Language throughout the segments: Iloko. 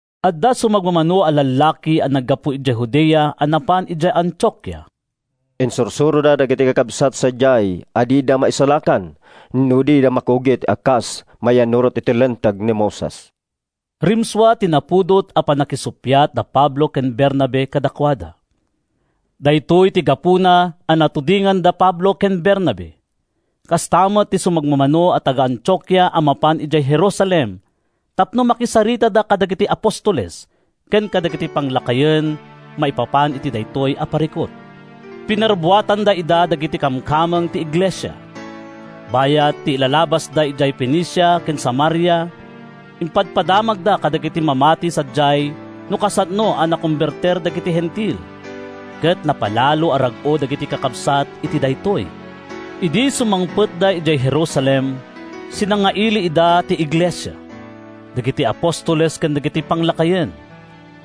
Adda sumagmamano a lallaki a naggapu idiay Judea a napan idiay Antiokia. Insursuroda dagiti kakabsat sadiay a dida maisalakan no dida makugit kas mayannurot iti Linteg ni Moises. Rimsua ti napudot a pannakisuppiat da Pablo ken Bernabe kadakuada. Daytoy ti gapuna a natudingan da Pablo ken Bernabe, kasta met ti sumagmamano a taga-Antiokia a mapan idiay Jerusalem tapno makisaritada kadagiti apostoles ken kadagiti panglakayen maipapan iti daytoy a parikut. Pinarubbuatan ida dagiti kamkameng ti iglesia. Bayat ti ilalabasda idiay Fenicia ken Samaria, impadpadamagda kadagiti mamati sadiay no kasano a nakombertir dagiti Hentil. Ket napalalo a rag-o dagiti kakabsat iti daytoy. Idi sumangpetda idiay Jerusalem, sinangaili ida ti iglesia, dagiti apostoles ken dagiti panglakayen.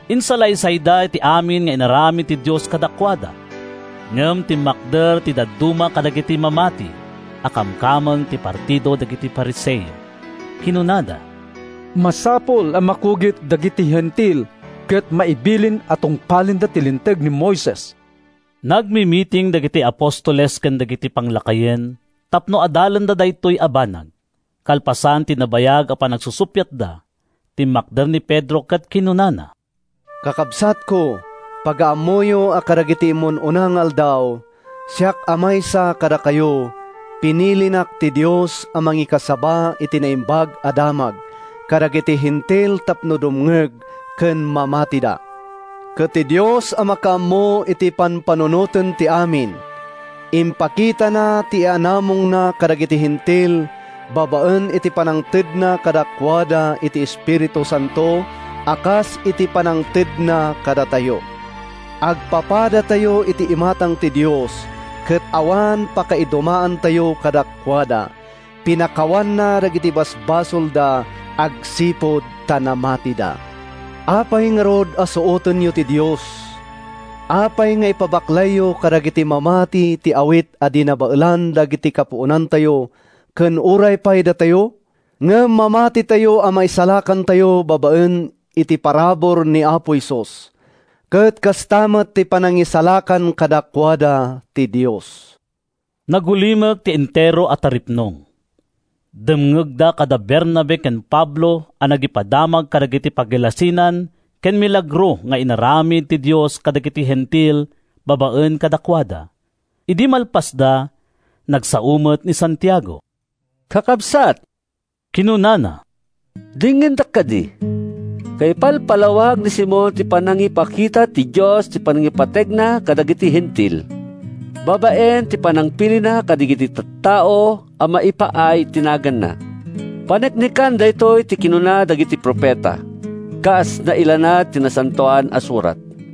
Insalaysayda ti amin nga inaramid ti Dios kadakuada. Ngem timmakder ti dadduma kadagiti mamati a kamkameng ti partido dagiti Fariseo. Kinunada, “Masapul a makugit dagiti Hentil ket maibilin a tungpalenda ti Linteg ni Moises.” Nagmimiting dagiti apostoles ken dagiti panglakayen tapno adalenda daytoy a banag. Kalpasan ti nabayag a panagsusuppiatda, timmakder ni Pedro ket kinunana, “Kakabsatko, pagaammoyo a kadagiti immun-una nga aldaw, siak a maysa kadakayo, pinilinak ti Dios a mangikasaba iti Naimbag a Damag kadagiti Hentil tapno dumngeg ken mamatida. Ket ti Dios a makaammo iti pampanunoten ti amin, impakitana ti yaanamongna kadagiti Hentil babaen iti pannangtedna kadakuada iti Espiritu Santo a kas iti pannangtedna kadatayo. Agpapadatayo iti imatang ti Dios ket awan pakaidumaantayo kadakuada. Pinakawanna dagiti basolda agsipud ta namatida. Apay ngarud a suotenyo ti Dios? Apay nga ipabaklayyo kadagiti mamati ti awit a di nabaelan dagiti kapuonantayo ken uray pay datayo? Ngem mamatitayo a maisalakantayo babaen iti parabur ni Apo Jesus, ket kasta met ti panangisalakan kadakuada ti Dios.” Nagulimek ti entero a taripnong. Dimngegda kada Bernabe ken Pablo a nagipadamag kadagiti pagilasinan ken milagro nga inaramid ti Dios kadagiti Hentil babaen kadakuada. Idi malpasda, nagsao met ni Santiago. “Kakabsat,” kinunana, “denggendak kadi! Kaipalpalawag ni Simon ti panangipakita ti Dios iti panangipategna kadagiti Hentil, babaen iti panangpilina kadagiti tattao a maipaay iti naganna. Paneknekan daytoy ti kinuna dagiti profeta, kas nailanad iti Nasantoan a Surat: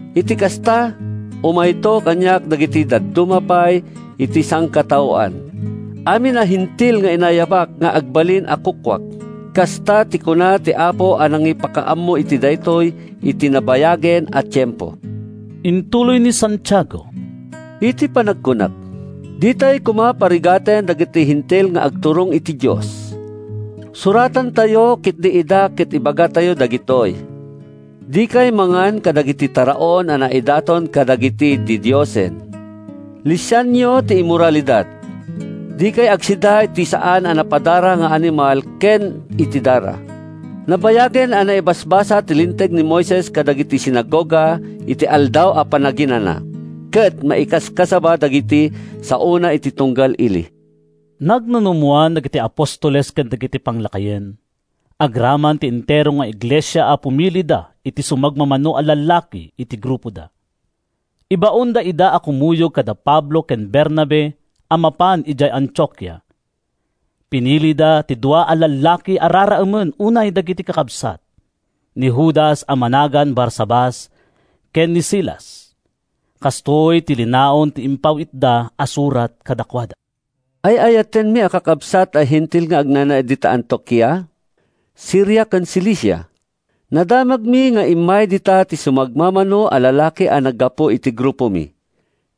Iti kasta, umayto kaniak dagiti dadduma pay iti sangkataoan, amin a Hentil nga inayabak nga agbalin a kukuak. Kasta ti kuna ti Apo a nangipakaammo iti daytoy iti nabayagen a tiempo.’” Intuloy ni Santiago, “Iti panagkunak, ditay koma parigaten dagiti Hentil nga agturong iti Dios. Suratantayo ketdi ida ket ibagatayo dagitoy: ‘Dikay mangan kadagiti taraon a naidaton kadagiti didiosen. Lisianyo ti immoralidad. Dikay agsida iti saan a napadara nga animal ken iti dara.’ Nabayagen a naibasbasa ti Linteg ni Moises kadagiti sinagoga iti Aldaw a Panaginana, ket maikaskasaba dagiti saona iti tunggal ili.” Nagnunumoan dagiti apostoles ken dagiti panglakayen, agraman ti entero nga iglesia a pumilida iti sumagmamano a lallaki iti grupoda. Ibaonda ida a kumuyog kada Pablo ken Bernabe a mapan idiay Antiokia. Pinilida ti dua a lallaki a raraemen unay dagiti kakabsat, ni Judas a managan Barsabas ken ni Silas. Kastoy ti linaon ti impaw-itda a surat kadakuada: “Ay-ayatenmi a kakabsat a Hentil nga agnanaed dita Antiokia, Siria ken Cilicia: “Nadamagmi nga immay dita ti sumagmamano a lallaki a naggapu iti grupomi,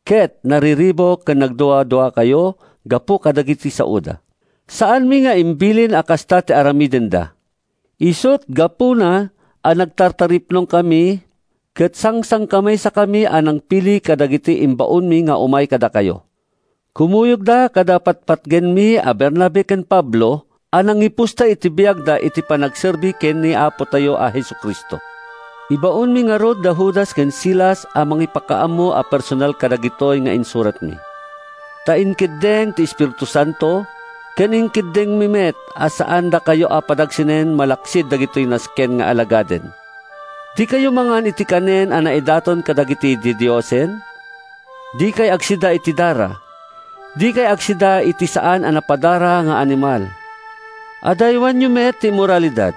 ket nariribuk ken nagduaduakayo gapu kadagiti saoda. Saanmi nga imbilin a kasta ti aramidenda. Isut’ gapuna a nagtataripnongkami ket sangsangkamaysakami a nangpili kadagiti ibaonmi nga umay kadakayo. Kumuyogda kada patpatgenmi a Bernabe ken Pablo a nangipusta iti biagda iti panagserbi ken ni Apotayo a Jesu-Cristo. Ibaonmi ngarud da Judas ken Silas a mangipakaammo a personal kadagitoy nga insuratmi. Ta inkeddeng ti Espiritu Santo, ken inkeddengmi met a saandakayo a padagsenan malaksid dagitoy nasken nga alagaden: Dikayo mangan iti kanen a naidaton kadagiti didiosen. Dikay agsida iti dara. Dikay agsida iti saan a napadara nga animal. Adaywanyo met ti immoralidad.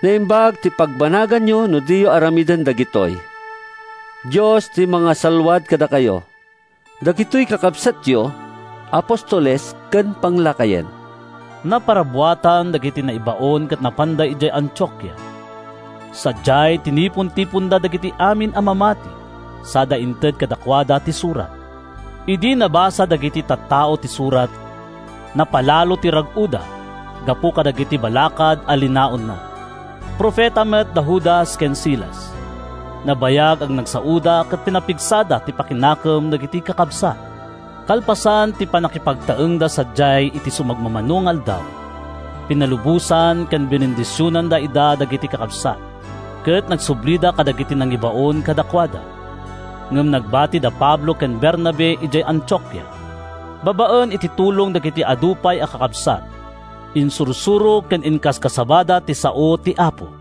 Naimbag ti pagbanaganyo no diyo aramiden dagitoy. Dios ti mangsalluad kadakayo. Dagitoy kakabsatyo, Apostoles ken Panglakayen.” Naparubbuatan dagiti naibaon ket napanda idiay Antiokia. Sadiay, tinipontiponda dagiti amin a mamati sada inted kadakuada ti surat. Idi nabasa dagiti tattao ti surat, napalalo ti rag-oda, gapu kadagiti balakad a linaonna. Profeta met da Judas ken Silas. Nabayag a nagsaoda ket pinapigsada ti pakinakem dagiti kakabsat. Kalpasan ti pannakipagtaengda sadiay iti sumagmamano nga aldaw, pinalubosan ken binendisionan ida dagiti kakabsat, ket nagsublida kadagiti nangibaon kadakuada. Ngem nagbati da Pablo ken Bernabe idiay Antiokia. Babaen iti tulong dagiti adu pay a kakabsat, insursuro ken inkaskasabada ti sao ti Apo.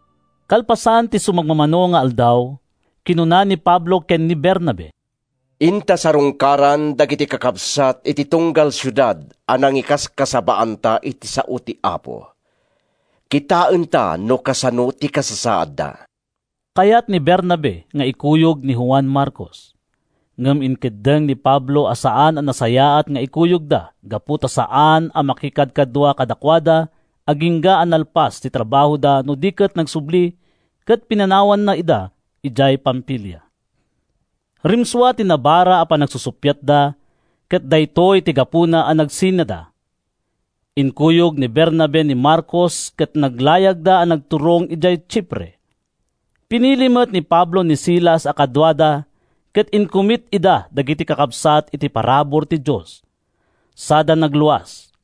Kalpasan ti sumagmamano nga aldaw, kinuna ni Pablo ken ni Bernabe, “Inta sarungkaran dagiti kakabsat iti tunggal siudad a nangikaskasabaanta iti sao ti Apo. Kitaenta no kasano ti kasasaadda.” Kayat ni Bernabe nga ikuyog ni Juan Marcos, ngem inkeddeng ni Pablo a saan a nasayaat nga ikuyogda gapu ta saan a nakikadkadua kadakuada agingga a nalpas ti trabahoda no di ket nagsubli ket pinanawanna ida idiay Pamfilia. Rimsua ti nabara a panagsuppiatda ket daytoy ti gapuna a nagsinada. Inkuyog ni Bernabe ni Marcos ket naglayagda a nagturong idiay Chipre. Pinili met ni Pablo ni Silas a kaduana ket inkumit ida dagiti kakabsat iti parabur ti Dios, sada nagluas.